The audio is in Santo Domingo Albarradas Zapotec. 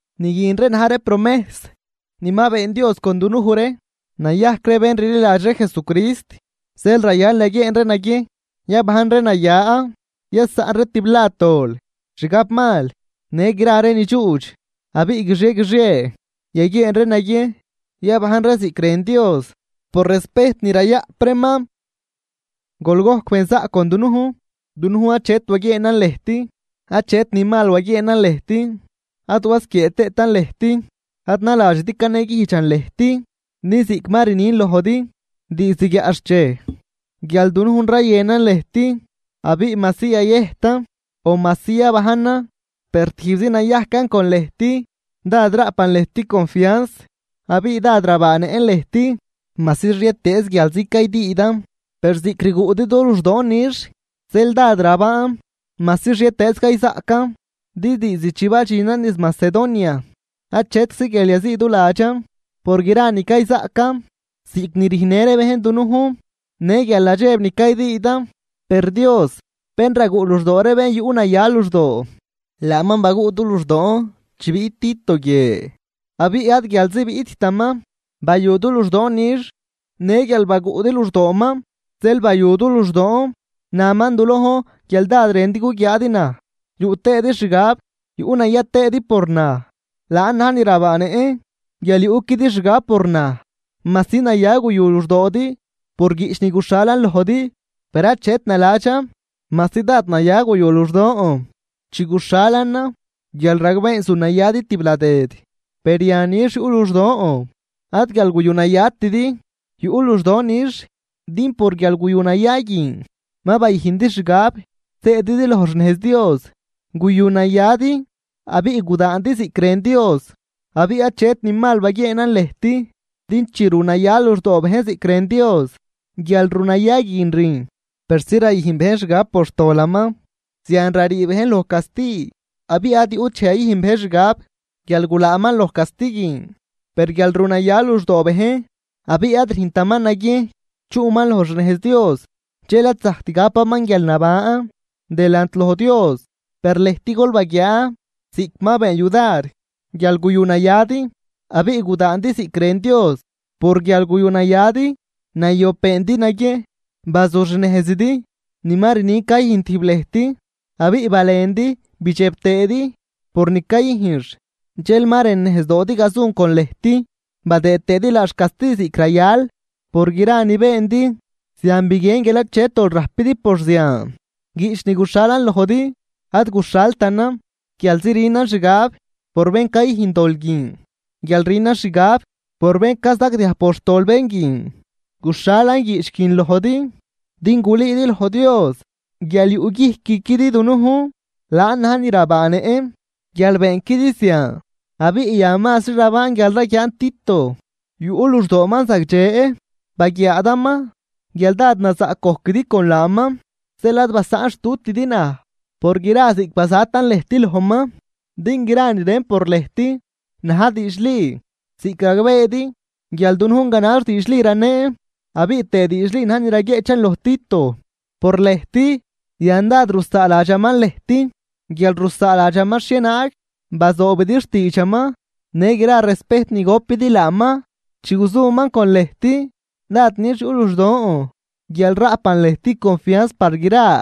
Ni guin ree na̱j ree promejs ni ma been Dios con dunuj ree nayajc ree bén rliladx ree Jesucrist. Zeel rayal yaguieen ree naguiejn yabajn ree naya. Yasaꞌn ree tiblad dol, xgab mal, në gra ree ni dxuudx. Abiꞌ guixie guixie yaguieen ree naguiejn yabajn ree ziꞌc rën Dios por respejt ni rayaꞌp reeman. ¡Gol gojc benzaꞌc con dunujn! Dunujn achet waguieenan lëjt, achet ni mal waguieenan lëjt ad wasquiee tëëtan lëjt. Ad naladxidi caneguijdxan lëjt, din ziꞌc ma rnin lojdi diizd guiaꞌxchej guial dunujn rayënan lëjt, abiꞌ majsi yayëjtan o majsi yabajnan per tijbzi nayajcan con lëjt. Dád raꞌpan lëjt confianz abiꞌ dád rabaanëꞌn lëjt. Majsi xhietëëz guialzi caydüüdan, per ziꞌc rguꞌdi du luxdoon nix zeel dád rabaan, majsi xhietëëz cayzaꞌcan Din diizd chi badxinan niz Macedonia achetczi guial yaziiduladxan por gra ni cayzaꞌcan, ziꞌc ni rüjnnë ree bejn dunujn në guialnadxeb ni caydüüdan. Per Dios bén raguꞌ luxdoo ree bén yuꞌnaya luxdoo, laaman baguꞌ du luxdoon chi biꞌt Tito guie. Abiꞌ ad guialzi biꞌttaman bayu du luxdoon nix, në guial baguꞌdi luxdooman zeel bayu du luxdoon. Naman du lojn guial dád rëndi guguiaadi naj, yuꞌ tëëdi xgab yuꞌnaya tëëdi por naj. Laan na̱j ni rabaanëꞌn guial yuꞌquidi xgab por naj. Majsi naya guyu luxdoodi por guiꞌch ni guxhalan lojdi, per achet naladxan. Majsi dád naya guyu luxdon chi guxhalanan guial ragbeen zunayadi tibladëd, per yan nix yuꞌ luxdon, ad guial guyu nayatidi, yuꞌ luxdoon nix din por guialguyunaya guin ma bayüjndi xgab zëdi loj xnejz Dios. Guyunayadi abiꞌ gudaandi ziꞌc rën Dios, abiꞌ achet ni mal baguieenan lëjt. Din chi runaya luxdoo bejn ziꞌc rën Dios, guialrunaya guin rüjn yudar persi rayüjn bejn xgab por xtolaman, zian rarii bejn loj casti, abiꞌ ad yuꞌt dxej yayüjn bejn xgab guial gulaaman loj casti guin. Per guial runaya luxdoo bejn abiꞌ ad rüjntaman naguiejn chuꞌman loj xnejz Dios, dxel ad zajct gapaman guialnaban delant loj Dios. Per lëjt gol baguiaa ziꞌc ma been yudar guial guyunayadi abiꞌ gudaandi ziꞌc rën Dios. Por guial guyunayadi nayob beendi naguiejn bazuxnejzidi ni ma rnin cayüjn tijb lëjt, abiꞌ balendi bidxeb tëëdi por ni cayüjnx. Dxel ma rënejzdoodi gazun con lëjt, badëë tëëdi laax casti ziꞌc rayal. Por gra ni beendi zian biguien guial achet dol rajpidi por zian. Guiꞌch ni guxhalan lojdi, ad guxhaltanan guialzi rünan xgab por bén cayüjn dol guin o guial rünan xgab por bén cazagdiaj por xtol bén guin. Guxhalan guiꞌch guin lojdi din gulüüdi loj Dios guial yuꞌguijcquidi dunujn. Laan na̱j ni rabaanëꞌn guial beenquidi zian. Abiꞌ yan mazri rabaan guial raguiaan Tito yuꞌ luxdooman zagdxe baguiaadaman guial dád nazaꞌc gojquidi con laaman. Zeel ad basaꞌnxtutidi naj por gra ziꞌc bazatan lëjt lojman. Din gra ni rën por lëjt na̱j diidxli ziꞌc ragbeedi guial dunujn ganax diidxli raneen, abiꞌ tëë diidxli na̱j ni raguieꞌchan loj Tito por lëjt. Yan dad rusaaladxaman lëjt guial rusaaladxaman xhienaag bazoobidi xtiidxaman në gra respejt ni gopidi laaman chi guzuman con lëjt. Dád nix yuꞌ luxdon guial raꞌpan lëjt confianz par gra.